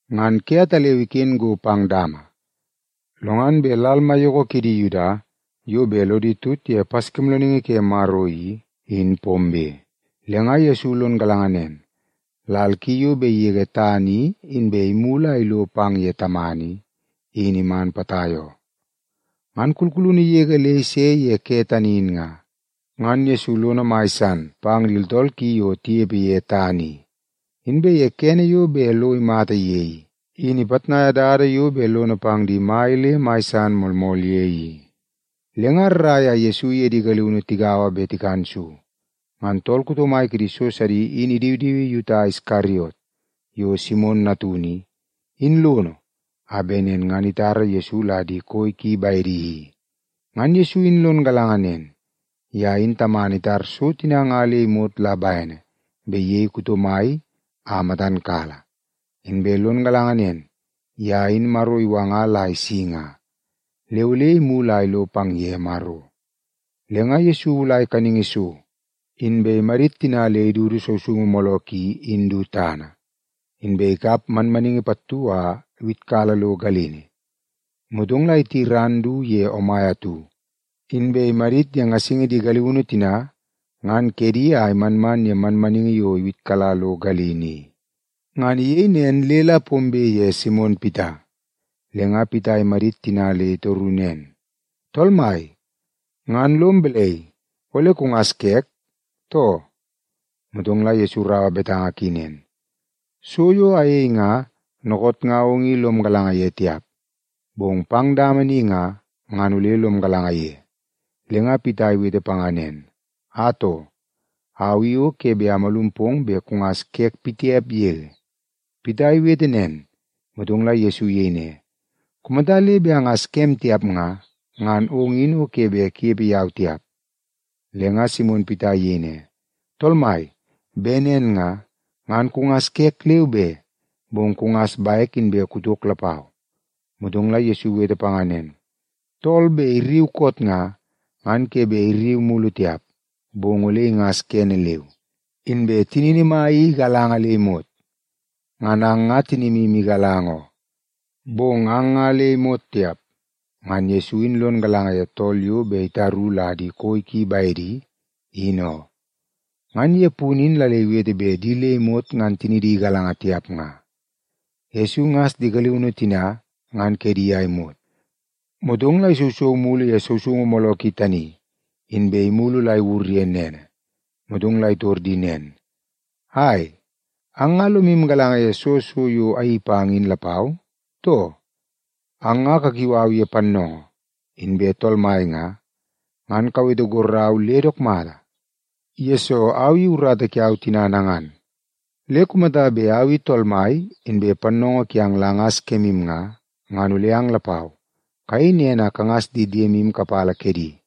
Ngan ke ataleu iken go pang dama, lo ngan bet lal maiyoko kidi Yuda yo bet lodi tut ye Paskimoolooningi ke Maro i, in pombe. Le nga Yesu lon galanga nen, lal ki yo bet igege tana i inbe imulu a ilo pang ye Tamana i, in iman potai oo. Ngan kulkulunu yege le ise ye kene tani in nga, ngan Yesu lono mai san pang di tooltool ki ye taunu yo tinepe ye tana i. Inbe ye kene yo bet lo imata ye i, in ipitnaia dada yo bet lono pang di mai le mai san moolmool ye i. Le nga rrai a Yesu iye di galiunu tigaua bet tikan so. Ngan tool kuto mai kidi so sidi in idiwidiwi Yuta Iskariot, yo Simon natunu i, in lono a bet nen ngan itara Yesu la di koi ki bedi i. Ngan Yesu in lon galanga nen, ye in Tamana itar so tina nga le imot la bene bet iyei tool kuto mai a matan kala. Inbe lon galanga nen, ye in Maro iwanga la isi nga, le ole imulu a ilo pang ye Maro. Le nga Yesu iwulai kaningi so, inbe imadit tina le idudu sousoungu mooloo ki in du tana, inbe ikap manmaningi pattu a iwitkala lo galini. Motong la iti ran du ye omai atu, inbe imadit ye ngasingi di galiunu tina ngan kedi a imanman ye manmaningi yo iwitkala lo galini i. Ngan iyei nen le la pombe ye Simon Pita, le nga Pita imadit tina le itoru nen, “Tool Mai, ngan lom balai, ole kungas kek, too?” Motong la Yesu iraua betanga ki nen, “So yo ayei nga, dookoot nga ong i lom galanga ye tiap, bong pang dama ni nga, ngan ole lom galanga ye.” Le nga Pita iwete panga nen, “Atoo, au i o ke bet amalum pong bet kungas kek pitiap yege.” Pita iwete nen, motong la Yesu iyei ne, “Kumata le bet angas kem tiap nga, ngan ong i o ke bet kunepe yau tiap.” Le nga Simon Pita iyei ne, “Tool Mai, bet nen nga, ngan kungas kek leu be, bong kungas bek inbe kutok lapau.” Motong la Yesu iwete panga nen, “Tool bet irriu koot nga, ngan ke bet irriu mulu tiap, bong ole ingas kene leu, inbe tinini mai i igalanga le imot. Ngan ang nga tinimu igalanga oo, bong ang nga le imot tiap.” Ngan Yesu in lon galanga ye tool yo bet itaru la di koi ki bedi in oo. Ngan ye punu in la le iwete bet di le imot ngan tinidi igalanga tiap nga. Yesu ingas di galiunu tina ngan kedi a imot, motong la isousou mulu ye sousoungu mooloo ki tani, inbe imulu la iwur ye nene. Motong la itor di nen, “Ai, ang nga lomu galanga ye soo so yo ayeii pang in lapau, too? Ang nga kakiu au ye ‘Pannoongoo’ inbe ‘Tool Mai’ nga, ngan kawete gorrau le dook mata, yesoo au i urata kiau tina nangan. Le kumata bet au i Tool Mai inbe Pannoongoo kiang la angas kemu nga, ngan ole ang lapau, kayei nen a kangas di diemu kapala kedi.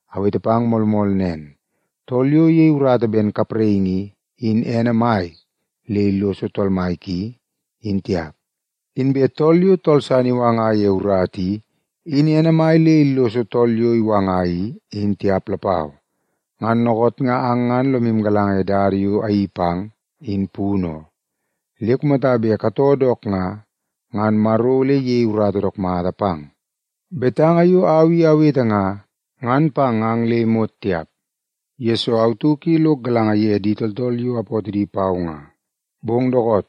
Awete pang moolmool nen, tool yo iyei urata ben kapraingi i, in ene mai le illoso tool mai ki, in tiap. Inbe tool yo tool san iwanga ye urata i, in ene mai le illoso tool yo iwanga i, in tiap lapau. Ngan dookoot nga ang ngan lomu galanga ye dada yo ayeii pang, in punu oo. Le kumata bet katoo dook nga, ngan Maro ole iyei urata dook mata pang. “Betanga yo au i awete nga, ngan pang ang le imot tiap, yesoo au tauk i lok galanga ye di tooltool yo apootoo di pau nga. Bong dookoot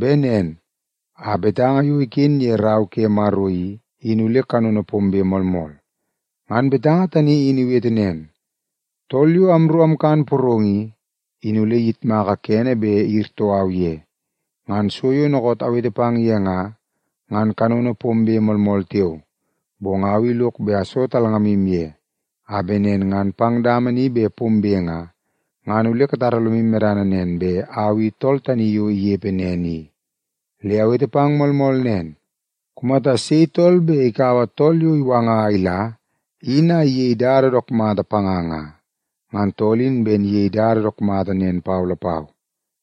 bet nen a betanga yo iken ye Rau ke Maro i, in ole kanono pombe moolmool. Ngan betanga tani in iwete nen, ‘Tool yo amru amkan porong i, in ole iyitmaka kene bet iyirtoo au ye.’ “Ngan so yo dookoot awete pang ye nga, ngan kanono pombe moolmool tiao. Bong au i lok bet aso talngamu ye, a bet nen ngan pang dama ni bet pombe nga, ngan ole katara lomu medana nen bet Au I Tool Tani Yo Inepe Nen I. Le awete pang moolmool nen, kumata sei tool bet ikaua tool yo awanga a ila, in a iyei dada dook mata panga nga, ngan tool in ben iyei dada dook mata nen pau lapau.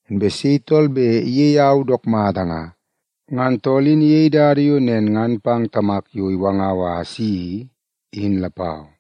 Inbe sei tool bet iyei au dook mata nga, ngan tool in iyei dada yo nen ngan pang Tamak yo iwangau a asi i, in lapau.”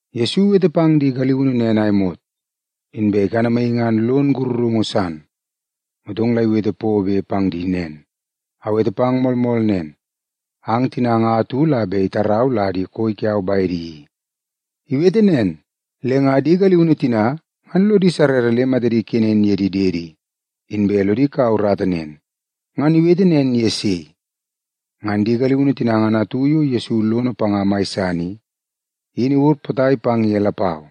Yesu iwete pang di galiunu nen a imot, inbe ikanamaii ngan lon sakarungu san. Motong la iwete pobe pang di nen, “Awete pang moolmool nen, ang tina nga atu la bet itarau la di koi kiau bedi i.” Iwete nen, le nga di galiunu tina ngan lodi sarrara le matadi ikenen ye di diedi, inbe lodi kaua urata nen, ngan iwete nen ye sei. Ngan di galiunu tina ngan atu yo Yesu lono panga mai san i, in iwur potai pang ye lapau.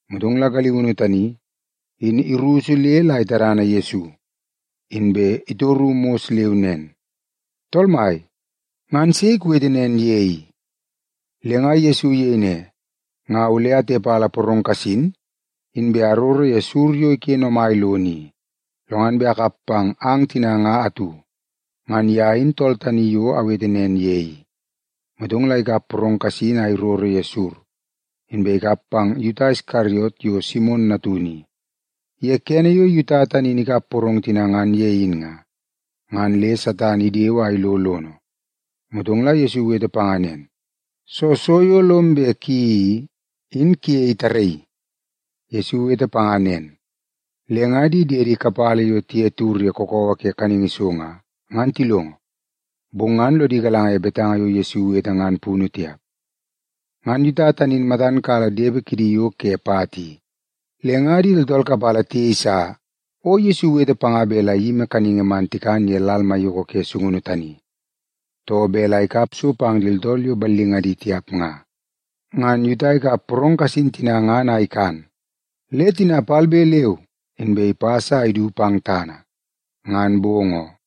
Motong la galiunu tani, in irusu le la itadana Yesu, inbe itoru mos leu nen, “Tool Mai, ngan sei kuwete nen ye i?” Le nga Yesu iyei ne, “Nga ole atepala porong kasin, inbe aroro ye sur yo iken omai lono i, lo ngan bet akap pang ang tina nga atu. Ngan ye in tool tani yo awete nen ye i.” Motong la ikap porong kasin a iroro ye sur, inbe ikap pang Yuta Iskariot yo Simon natunu i. Ye kene yo Yuta tani in ikap porong tina ngan ye in nga, ngan le Satan idewe a ilo lono. Motong la Yesu iwete panga nen, “Soo so yo lom bet kuyeii i, in kuyei tarraii.” Yesu iwete panga nen, le nga di diede kapala yo tiye tiwur ye kakawa ke kaningi so nga, ngan tilongo, bong ngan lodi galanga ye betanga yo Yesu iwete ngan punu tiap. Ngan Yuta tani in matan kala depe kidi yo ke pat i, le nga di tooltool kapala tiyeisa o Yesu iwete panga bet la iyimi kaningi man tikan ye lal maiyoko ke sungunu tani, too bet la ikap so pang di tooltool yo ballingadi tiap nga. Ngan Yuta ikap porong kasin tina ngan a ikan, le tina palbe leu inbe ipas a idu pang tana. Ngan bong oo.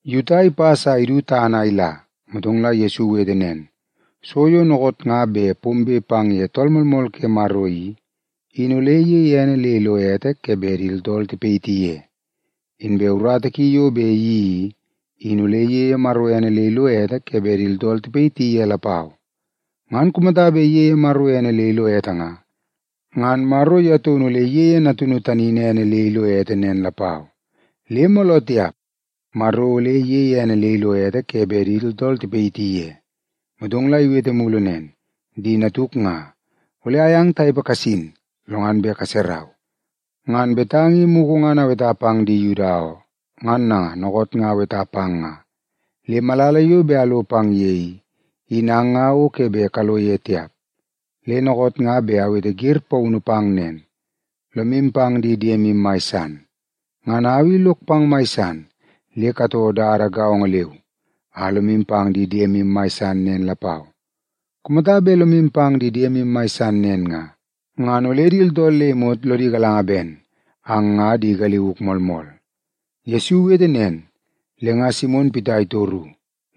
Yuta ipas a idu tana a ila, motong la Yesu iwete nen, “So yo dookoot nga bet pombe pang ye Tool Moolmool ke Maro i, in ole iyeie ene le ilo ete ke bet di tooltool tipayiti ye. Inbe urata ki yo bet iyeii i, in ole iyeie Maro ene le ilo ete ke bet di tooltool tipayiti ye lapau. Ngan kumata bet iyeie Maro ene le ilo ete nga, ngan Maro ye taunu ole iyeie Natunu tani in ene le ilo ete nen lapau. Le mooloo tiap Maro ole iyeie ene le ilo ete ke bet di tooltool tipayiti ye.” Motong la iwete mulu nen, “Di natuk nga, ole ayang tanepe kasin, lo ngan bet kaserau. Ngan betanga i mugu ngan aweta pang di Yuda oo, ngan nanga dookoot nga aweta pang nga. Le malala yo bet alo pang ye i, in ang nga o ke bet kalo ye tiap. Le dookoot nga bet awete wer paunu pang nen: Lomu pang di diemu mai san. Ngan au i lok pang mai san, le katoo dada gaongo leu a lomu pang di diemu mai san nen lapau. Kumata bet lomu pang di diemu mai san nen nga, ngan ole di tooltool le imot lodi galanga ben ang nga di galiuk moolmool.” Yesu iwete nen, le nga Simon Pita itoru.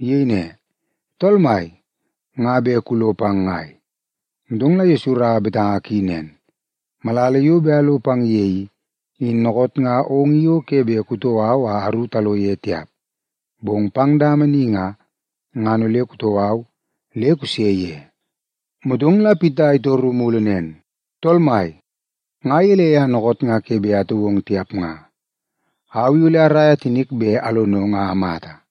Iyei ne, “Tool Mai, nga bet kulo pang ngai?” Motong la Yesu iraua betanga ki nen, “Malala yo bet alo pang ye i, in dookoot nga ong i o ke bet kutoo au a aru talo ye tiap. Bong pang dama ni nga, ngan ole kutoo au le kuse ye.” Motong la Pita itoru mulu nen, “Tool Mai, nga gelei a dookoot nga ke bet atoo ong tiap nga? Au i ole araia tinik bet alonong a amata.”